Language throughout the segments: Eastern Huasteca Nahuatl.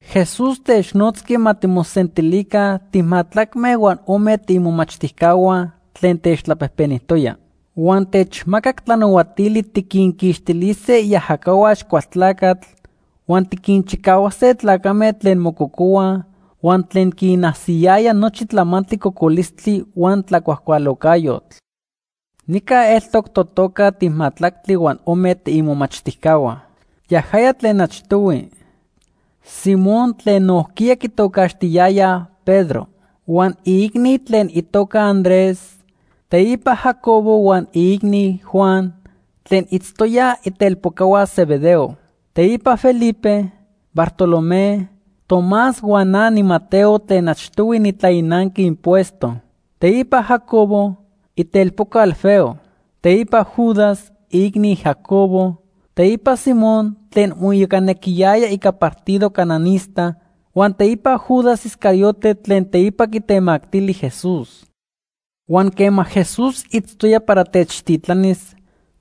Jesús technotzqui ma timosentilica timajtlacme huan ome tiimomachtijcahua tlen techtlapejpenijtoya. Huan techmacac tlanahuatili tiquinquixtilise iajacahua Axcualtlacatl huan tiquinchicahuase tlacame tlen mococohuaj huan tlen quinajsiyayaj nochi tlamantli cocolistli huan tlacuajcualocayotl. Nica eltoc totoca timajtlactli huan ome tiimomachtijcahua. Yajaya tlen achtohui: Simón tlen nojquiya quitocaxtiyayaj Pedro, huan iicni tlen itoca Andrés, teipa Jacobo huan iicni, Juan, tlen itztoyaj itelpocahua Zebedeo. Teipa Felipe, Bartolomé, Tomás huan na niMateo tlen achtohui nitlainanqui impuesto. Teipa Jacobo, itelpoca Alfeo. Teipa Judas, iicni Jacobo, teipa Simón tlen moiyocanequiyaya ica partido cananista, huan teipa Judas Iscariote tlen teipa quitemactili Jesús. Huan quema Jesús itztoya para techtitlanis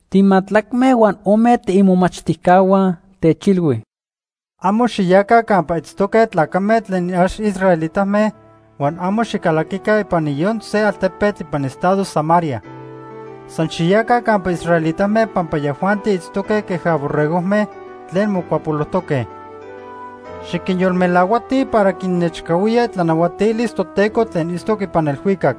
timajtlacme huan ome tiimomachtijcahua, techilhui: “Amo xiyaca campa itztoque tlacame tlen ax israelitame huan amo xicalaquica ipan niyon se altepetl ipan estado Samaria. San xiyaca campa israelitame pampa yajuanti itztoque queja borregojme tlen mocuapolojtoque. Xiquinyolmelahuatij para quinnechcahuía itlanahuatilis Toteco tlen itztoc ipan elhuicac.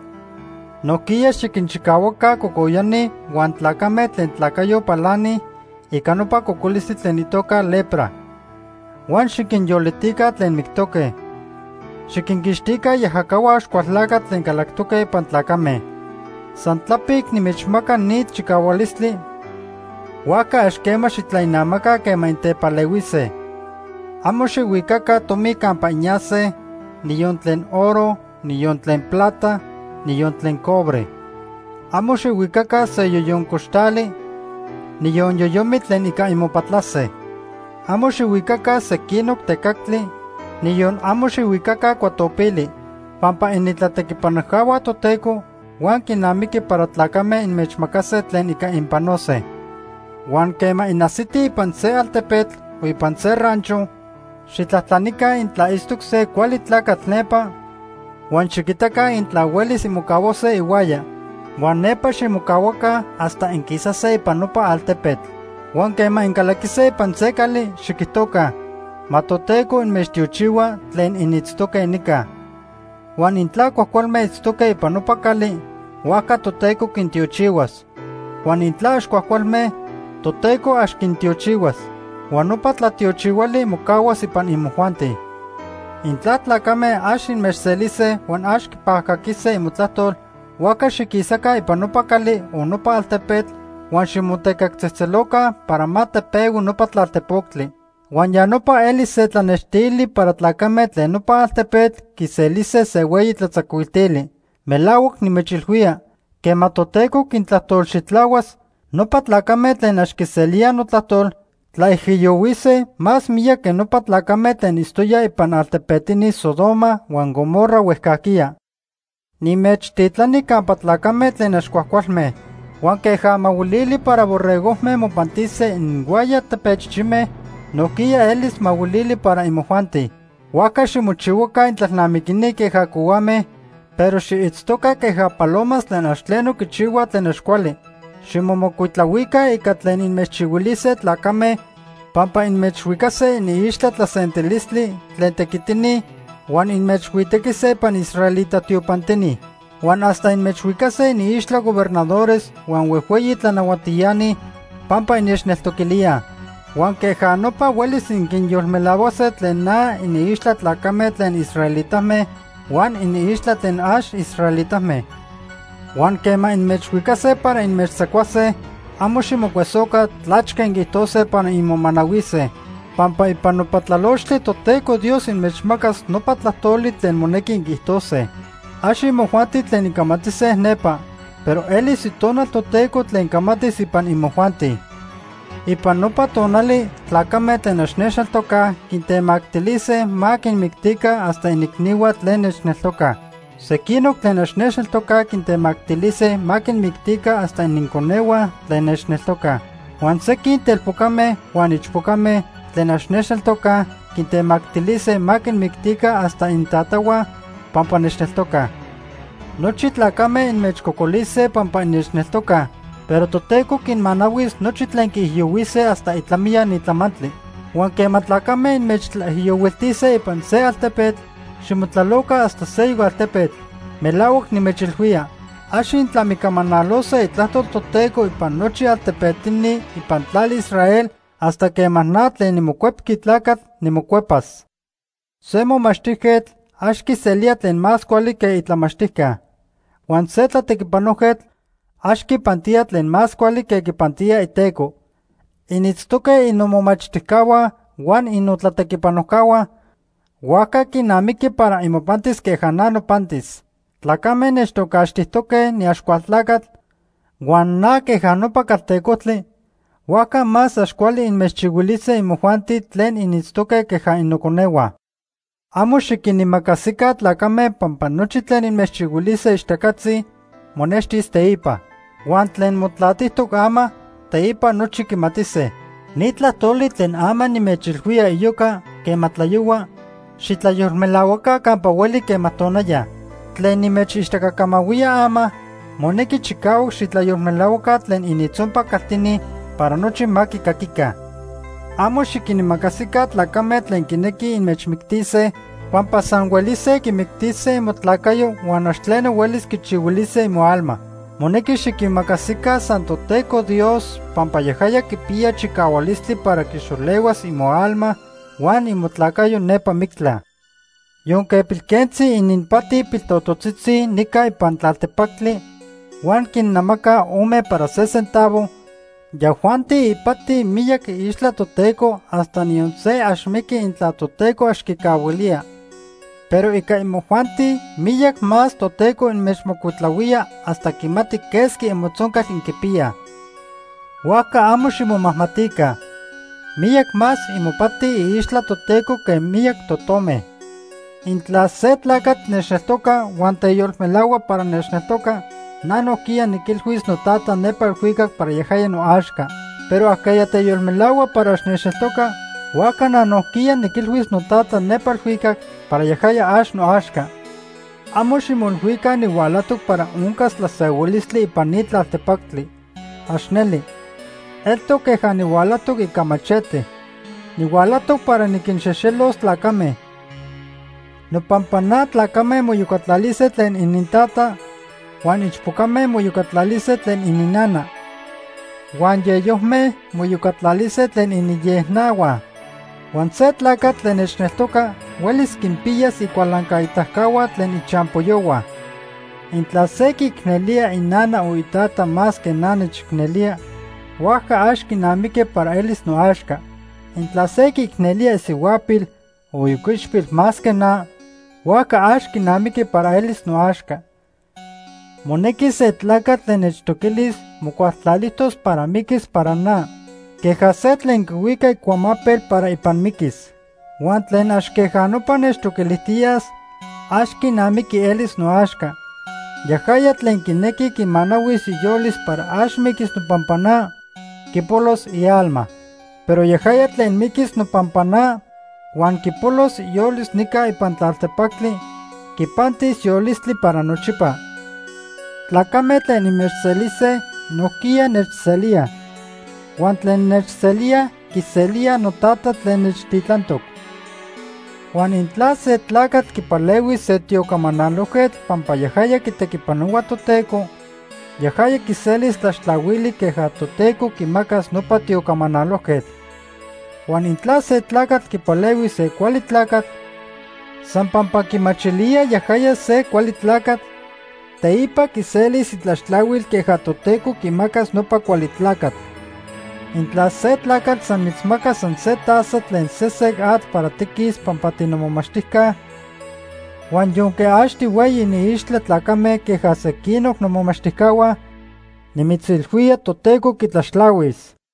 Nojquiya xiquinchicahuaca cocoyani huan tlacame tlen tlacayo palanij ica nopa cocolistli tlen itoca lepra. Huan xiquinyolitica tlen mictoque. Xiquinquixtica iajacahua Axcualtlacatl tlen calactoque ipan tlacame. San tlapic nimechmaca ni chicahualistli, huajca ax quema xitlainamaca quema intepalehuise. “Amo xijhuicaca tomi campa inyase, niyon tlen oro, niyon tlen plata, niyon tlen cobre. Amo xijhuicaca se yoyon coxtali, niyon yoyomitl tlen ica inmopatlase. Amo xijhuicaca sequinoc tecactli, niyon amo xijhuicaca cuatopili, pampa initlatequipanojcahua Toteco huan quinamiqui para tlacame inmechmacase tlen ica inpanose. “Huan quema inajsitij ipan se altepetl o ipan se rancho, xitlajtlanica intla itztoc se cuali tlacatl nepa huan xiquitaca intla huelis inmocahuase ihuaya. Huan nepa ximocahuaca hasta inquisase ipan nopa altepetl. Huan quema incalaquise ipan se cali, xiquijtoca: ‘Ma Toteco inmechtiochihua tlen initztoque nica.’ Huan intla cuajcualme itztoque ipan nopa cali, huajca Toteco quintiochihuas. Huan intla ax cuajcualme, Toteco ax quintiochihuas. Huan nopa tlatiochihuali mocahuas ipan imojuanti. Intla tlacame ax inmechselise huan ax quipajcaquise imotlajtol, huajca xiquisaca ipan nopa cali o nopa altepetl, huan ximotecactzejtzeloca para ma tepehui nopa tlalpotectli. Huan ya nopa elis se tlanextili para tlacame tlen nopa altepetl quiselise se hueyi tlatzacuiltili. Melahuac nimechilhuía, quema Toteco quintlajtolxitlahuas, nopa tlacame tlen ax quiselíaj notlajtol, tlaijiyohuise más miyac que nopa tlacame tlen itztoyaj ipan altepetini Sodoma huan Gomorra huejcajquiya. “Nimechtitlani campa tlacame tlen ax cuajcualme. Huan queja mahuilili para borregojme mopantise ininhuaya tepechichime, nojquiya elis mahuilili para imojuanti. Huajca ximochihuaca intlalnamiquini queja cohuame, pero xiitztoca queja palomas tlen ax tleno quichihuaj tlen ax cuali. Ximomocuitlahuica ica tlen inmechchihuilise tlacame pampa inmechhuicase iniixtla tlasentilistli tlen tequitini huan inmechhuitequise ipan israelita tiopantini. Huan hasta inmechhuicase iniixtla gobernadores huan huejhueyi tlanahuatiani pampa innechneltoquilíaj. Huan queja nopa huelis inquinyolmelahuase tlen na iniixtla tlacame tlen israelitame huan iniixtla tlen ax israelitame. Huan quema inmechhuicase para inmechtzacuase, amo ximocuesoca tlachque inquiijtose para inmomanahuise, pampa ipan nopa tlalochtli Toteco Dios inmechmacas nopa tlajtoli tlen monequi inquiijtose. Ax imojuanti tlen incamatise nepa, pero elis Itonal Toteco tlen camatis ipan imojuanti. “Ipan nopa tonali tlacame tlen ax nechneltocaj quintemactilise ma quinmictica hasta iniicnihua tlen nechneltocaj. Sequinoc tlen ax nechneltocaj quintemactilise ma quinmictica hasta ininconehua tlen nechneltocaj. Huan sequin telpocame huan ichpocame tlen ax nechneltocaj quintemactilise ma quinmictica hasta inintatahua pampa nechneltocaj. Nochi tlacame inmechcocolise pampa innechneltocaj, pero Toteco quinmanahuis nochi tlen quiijiyohuise hasta itlamiya ni tlamantli. Huan quema tlacame inmechtlaijiyohuiltise ipan se altepetl, ximotlaloca hasta seyoc altepetl. Melahuac nimechilhuía, ax intlamicamanalose Itlajtol Toteco ipan nochi altepetini ipan tlali Israel hasta quema na tlen niMocuepqui Tlacatl nimocuepas. “Se momachtijquetl ax quiselía tlen más cuali que itlamachtijca. Huan se tlatequipanojquetl ax quipantía tlen más cuali que quipantía iteco. Initztoque innomomachtijcahua huan innotlatequipanojcahua, huajca quinamiqui para imopantis queja na nopantis. Tlacame nechtocaxtijtoque niAxcualtlacatl huan na queja nopa caltecojtli, huajca más ax cuali inmechchihuilise imojuanti tlen initztoque queja innoconehua. “Amo xiquinimacasica tlacame pampa nochi tlen inmechchihuilise ixtacatzi monextis teipa. Huan tlen motlatijtoc ama, teipa nochi quimatise. Ni tlajtoli tlen ama nimechilhuía iyoca quema tlayohua, xitlayolmelahuaca campa hueli quema tonaya. Tlen nimechixtacacamahuía ama, monequi chicahuac xitlayolmelahuaca tlen inintzonpac caltini para nochi ma quicaquica. Amo xiquinimacasica tlacame tlen quinequij inmechmictise, pampa san huelise quimictise imotlacayo huan ax tleno huelis quichihuilise imoalma. Monequi xiquimacasica san Toteco Dios pampa yajaya quipiya chicahualistli para quixolehuas imoalma huan imotlacayo nepa mictla. “Yonque pilquentzi ininpati piltototzitzi nica ipan tlaltepactli huan quinnamacaj ome para se centavo, yajuanti ipatij miyac iixtla Toteco hasta niyon se ax miqui intla Toteco ax quicahuilía. Pero ica imojuanti miyac más Toteco inmechmocuitlahuía hasta quimati quesqui imotzoncal inquipiyaj. Huajca amo ximomajmatica. Miyac más imopati iixtla Toteco que miyac totome. “Intla se tlacatl nechneltoca huan teyolmelahua para nechneltoca, na nojquiya niquilhuis noTata nepa elhuicac para yajaya noaxca. Pero ajqueya teyolmelahua para ax nechneltoca, huajca na nojquiya niquilhuis noTata nepa elhuicac para yajaya ax noaxca. “Amo ximoilhuica nihualajtoc para oncas tlasehuilistli ipan ni tlaltepactli. ¡Ax neli! Eltoc queja nihualajtoc ica machete. Nihualajtoc para niquinxejxelos tlacame. Nopampa na tlacame moiyocatlalise tlen inintata, huan ichpocame moiyocatlalise tlen ininnana. Huan yeyojme moiyocatlalise tlen iniyejnahua. Huan se tlacatl tlen nechneltoca huelis quinpiyas icualancaitacahua tlen ichampoyohua. “Intla se quiicnelía inana o itata más que na nechicnelía, huajca ax quinamiqui para elis noaxca. Intla se quiicnelía isihuapil o ioquichpil más que na, huajca ax quinamiqui para elis noaxca. Monequi se tlacatl tlen nechtoquilis mocualtlalijtos para miquis para na queja se tlen quihuica icuamapel para ipan miquis. Huan tlen ax queja nopa nechtoquilijtiyas, ax quinamiqui elis noaxca. Yajaya tlen quinequi quimanahuis iyolis para ax miquis nopampa na, quipolos ialma. Pero yajaya tlen miquis nopampa na huan quipolos iyolis nica ipan tlaltepactli, quipantis yolistli para nochipa. “Tlacame tlen inmechselise, nojquiya nechselíaj. Huan tlen nechselía, quiselía noTata tlen nechtitlantoc. Huan intla se tlacatl quipalehuis se tiocamanalojquetl pampa yajaya quitequipanohua Toteco, yajaya quiselis tlaxtlahuili queja Toteco quimacas nopa tiocamanalojquetl. Huan intla se tlacatl quipalehuis se cuali tlacatl, san pampa quimachilía yajaya se cuali tlacatl, teipa quiselis itlaxtlahuil queja Toteco quimacas nopa cuali tlacatl. Intla se tlacatl san mitzmacas san se taza tlen sesec atl para tiquis pampa tinomomachtijca, huan yonque ax tihueyi iniixtla tlacame queja sequinoc nomomachtijcahua, nimitzilhuía Toteco quitlaxtlahuis.”